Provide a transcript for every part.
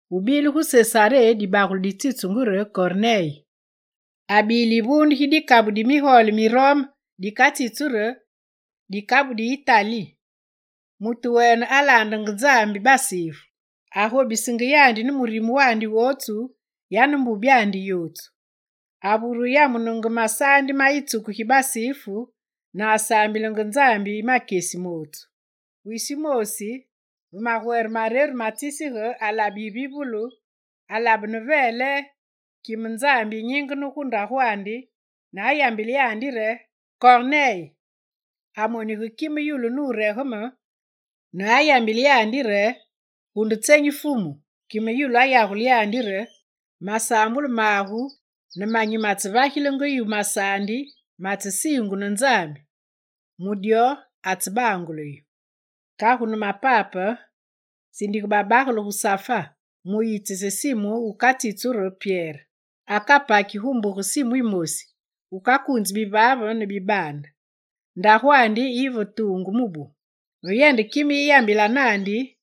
Gubile gu Sesaré dibagele ditsitsungu re Korneye, abile yivuunde gi dikabu di kame migole mi Rome dikatsitsu re: «dikabu di Itali». Mutu wene alaandenge Nzambi basifu, agobisenge yandi ne murime wandi wootsu, yane mbubyandi yootsu. Avure yamunenge masaandi ma yitsuku gi basifu ne asaambilenge Nzambi makyesi mootsu. Wisi wumoosi, ve magwere mareru ma tsisige, alabe yivivulu, alabe ne veele kime Nzambi yinyingene gu ndagwandi ne ayambile yandi re: «Korneye!» Amonige kime yulu nuregeme ne ayambile yandi re: «Gu nde tsenyi, Fumu?» Kime yulu ayagule yandi re: «Masaambulu magu ne manyi matsevagilenge yu masaandi matsesiingu ne Nzambi, mu dyo atsebangule yu. Kagu ne mapape sindige babagele gu Safa mu wuyitsise Simu wukatsitsu re Pyere. Akapaki gu mbuge Simu yimosi, wukakuunzi bivaave ne bibaande. Ndagwandi yi va tuungu mubu.» Ve yende kime yiyambila naandi,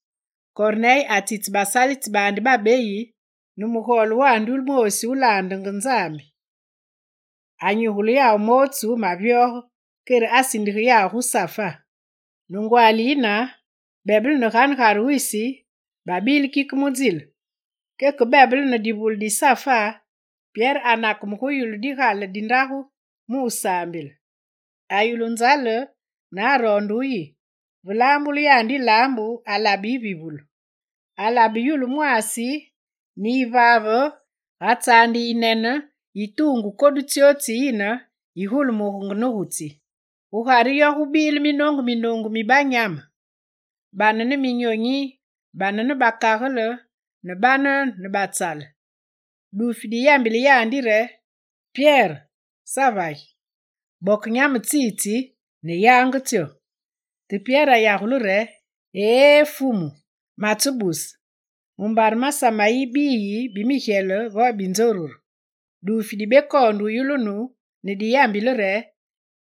Korneye atsitse basalitsi baandi babeyi ne mugole wandi wumoosi wulaandenge Nzambi. Anyigule yawu mootsu mavyoge, kere asindige yawu gu Safa. Ne ngwaali yine, bebele ne ganegare wisi, babile kike mu nzile, keke bebele ne divule di Safa, Pyere anakeme gu yulu digale di ndagu mu wusaambile. Ayulu nzale ne aroonde wuyi. Ve laambulu yandi yilaambu, alabe yivivulu. Alabe yulu mwaasi ne yivaave ga tsaande yinene yi tuungu kodu tsyootsu tsiyine yigulumugenge ne gu tsi. Gugare yo gubile minoongu minoongu mi banyame: bane ne minyonyi, bane ne bakagele, ne bane ne batsale. Duufi diyambile yandi re: «Pyere, savagi! Boke banyame tsitsi ne yange tsyo!» Te Pyere ayagule re: «Eé Fumu, matsebuse! Mumbare masame yi biyi bi migyele vo bi nzoruru.» Duufi dibekoonde wuyulunu ne diyambile yandi re: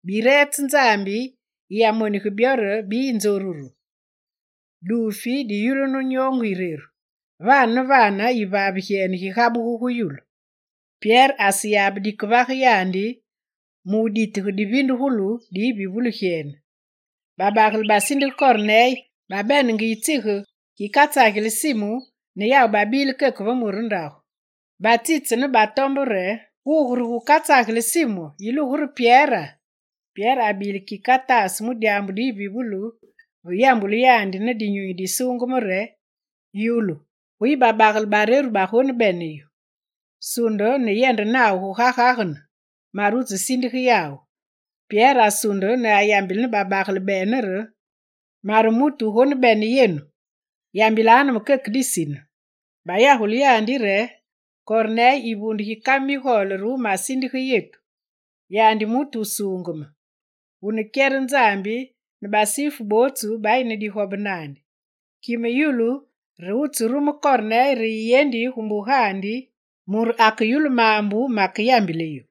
«Bireetse Nzambi yiyamonige byo re biyi nzoruru.» Duufi diyulunu nyoongu yireru, vane ne vane yivaave gyene gigabuge gu yulu. Pyere aseyabe dikevage yandi mu wuditige divindugulu di yivivulu gyene. Babagele basindige Korneye babenenge yitsige gikatsageli Simu ne yawu babile keke ve mure ndagu. Batsitse ne batombe re: «Gugu re gukatsageli Simu, yilugu re Pyera?» Pyere abile kike ataase mu dyaambu di yivivulu ve yambulu yandi ne Dinyunyi Disuungeme re: «Yulu, guyi babagele bareru bagonebene yu. Sunde ne yende nawu guga gagene, mare wutsesindige yawu.» Pyere asunde ne ayambile babagele bene re: «Mare mutu wugonebene yenu, yambilanu me keke disine.» Bayagule yandi re: «Korneye yivuunde gi kame migole re wumasindige yetu. Yandi mutu wusuungeme, wune kyere Nzambi, ne basifu bootsu bayi ne digobe naandi. Kime yulu re wutserume Korneye re yiyendi gu mbugandi mure akeyulu maambu makeyambile yu.»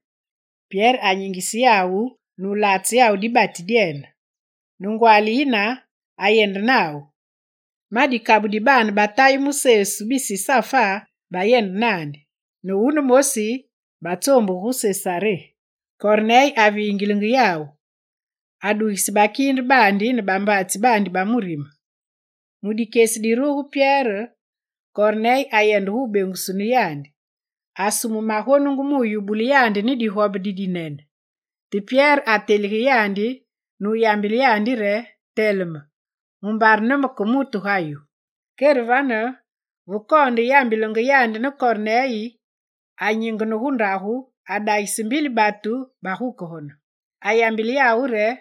Pyere anyingise yawu nulaatse yawu dibati dyene. Ne ngwaali yine, ayende nawu. Ma dikabu di baane ba Tayi mu Sesu bisi Safa bayende naandi. Ne wunemoosi, batsoombuge gu Sesaré. Korneye avingilenge yawu, adugise bakiinde baandi ne bambaatsi baandi ba murime. Mu dikyesi diruge Pyere, Korneye ayende gubeengusunu yandi. Asume magonungu mu wuyubule yandi ne digobe didinene. Te Pyere atelige yandi ne wuyambile yandi re: «Teleme, mumbare ne me make mutu ga yu.» Kere vane, ve koonde yambilenge yandi ne Korneye, anyingene gu ndagu adagise mbili batu bagukegene. Ayambile yawu re: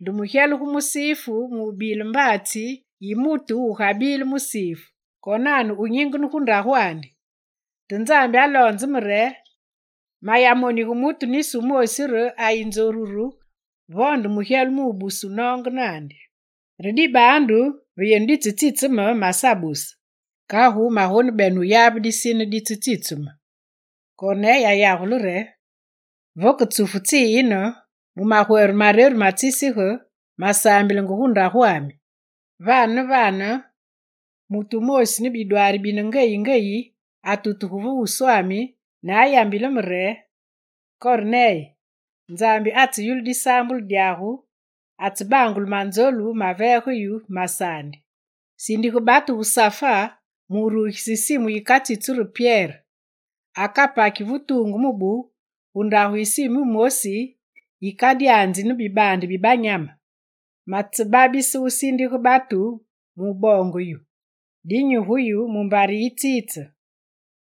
«Nde mugyele gu musifu mu wubile mbaatsi yi mutu wugabile musifu, konane wunyingene gu ndagwandi. Te Nzambi aloonze me re mayamonige mutu nisi womoosi re ayi nzoruru vo nde mugyele mu wubuse wunoonge naandi. Re dibaandu ve yenu ditsetsitse me, masabuse. Kagu magonebene wuyabe disine ditsetsitsu me.» Korneye ayagule re: «Vake tsufu tsiyine, mu magwere mareru ma tsisige, masaambilenge gu ndagwami. Vane ne vane mutu wumoosi ne bidwaari bine ngeyi ngeyi atutuge va wuswami ne ayambile me re: “Korneye, Nzambi atseyulu disaambulu dyagu, atsebangule manzolu maveegenge yu masaandi. Sindige batu gu Safa mu wurugise Simu yikatsitsu re Pyere. Akapaki ve tuungu mubu gu ndagu yi Simu yimosi, wukadyanzi ne bibaande bi banyame.” Matsebabise wusindige batu mu wuboonge yu, dinyi gu yu, mumbare yitsitse.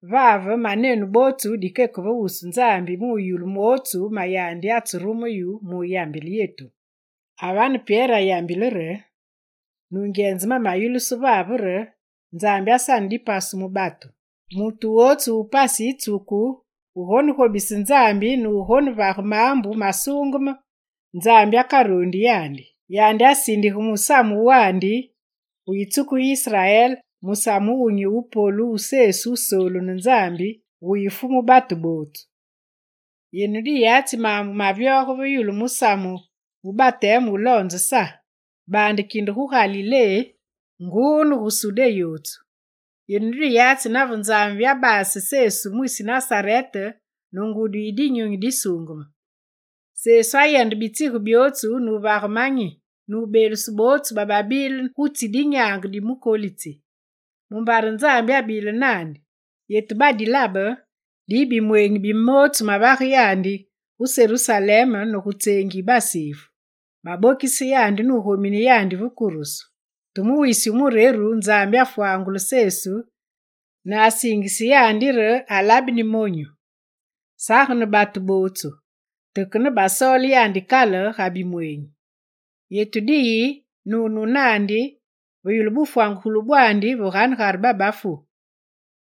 Vave manenu bootsu dikeke ve wusu Nzambi mu wuyulu mootsu ma yandi atserume yu mu wuyambile yetu.» A vane Pyere ayambile re: «Nungyenze mamayulusu vave re Nzambi asane dipasu mu batu: mutu wootsu wu pasi yitsuku, wugonegobise Nzambi ne wugonevage maambu masuungeme, Nzambi akaroondi yandi. Yandi asindige musamu wandi gu yitsuku gi Israel, musamu wumunyi wu polu mu Sesu Wusoolu ne Nzambi, wuyi Fumu batu bootsu. Yenu diyatsi maambu mavyoge ve yulu musamu wu bateme wuloonze Sa, baande kinde gu Galilé nguu ne gu Sudé yootsu. Yenu diyatsi nave Nzambi abaase Sesu mwisi Nasarete ne ngudi yi Dinyunyi Disuungeme. Sesu ayendenge bitsige byootsu nuvagenge manyi, nubeelusenge bootsu bababile gu tsi dinyaange di mukolitsi, mumbare Nzambi abile naandi. Yetu badilabe, diyi bimweenyi bi mootsu mavage yandi gu Serusalem ne gu tseengi yi basifu. Babokise yandi nugomine yandi va kurusu. Te mu wisi wu mureru, Nzambi afwangule Sesu ne asiingise yandi re alabeni monyu. Sage ne batu bootsu te ke yetu basoole yandi kale ga bimweenyi. Yetu diyi ne wunu naandi, ve yulu bufwangugulu bwandi ve ganegare babafu.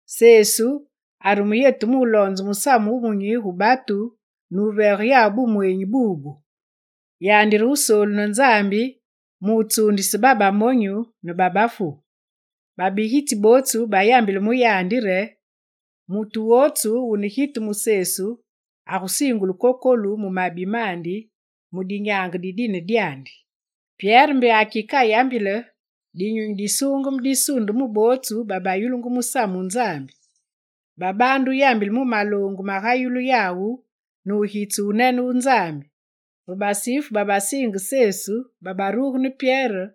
Sesu arume yetu muloonze Musamu Wumunyi gu batu ne wuvage bumweenyi bubu: Yandi re Wusoolu ne Nzambi mu wutsuundise babamonyu ne babafu. Babigitsi bootsu bayambile mu yandi re: Mutu wootsu wune gitu mu Sesu, agusiingulu kokolu mu mabi mandi mu dinyaange di dine dyandi.» Pyere mbe akike ayambile, Dinyunyi Disuungeme disunde mu bootsu babayulungu musamu wu Nzambi. Babaande wuyambile mu maloongu magayulu yawu ne wugitse wunene wu Nzambi. Ve basifu babasiinge Sesu babaruge ne Pyere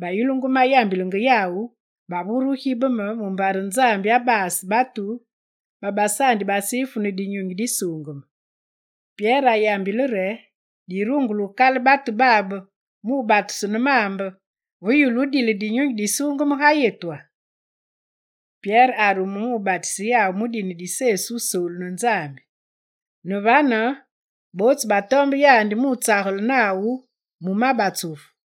bayulungu mayambilenge yawu, bavure wugibeme, mumbare Nzambi abaase batu babasaandi basifu ne Dinyunyi Disuungeme. Kere Pyere ayambile re: «Dirungule wukale batu babe mu batusu ne maambe, ve yulu wumane dile Dinyunyi Disuungeme ga yetwa?» Pyere arume mu wubatise yawu mu dine di Sesu Wusoolu ne Nzambi. Ne vane bootsu batombe yandi mutsagele nawu ma batsufu.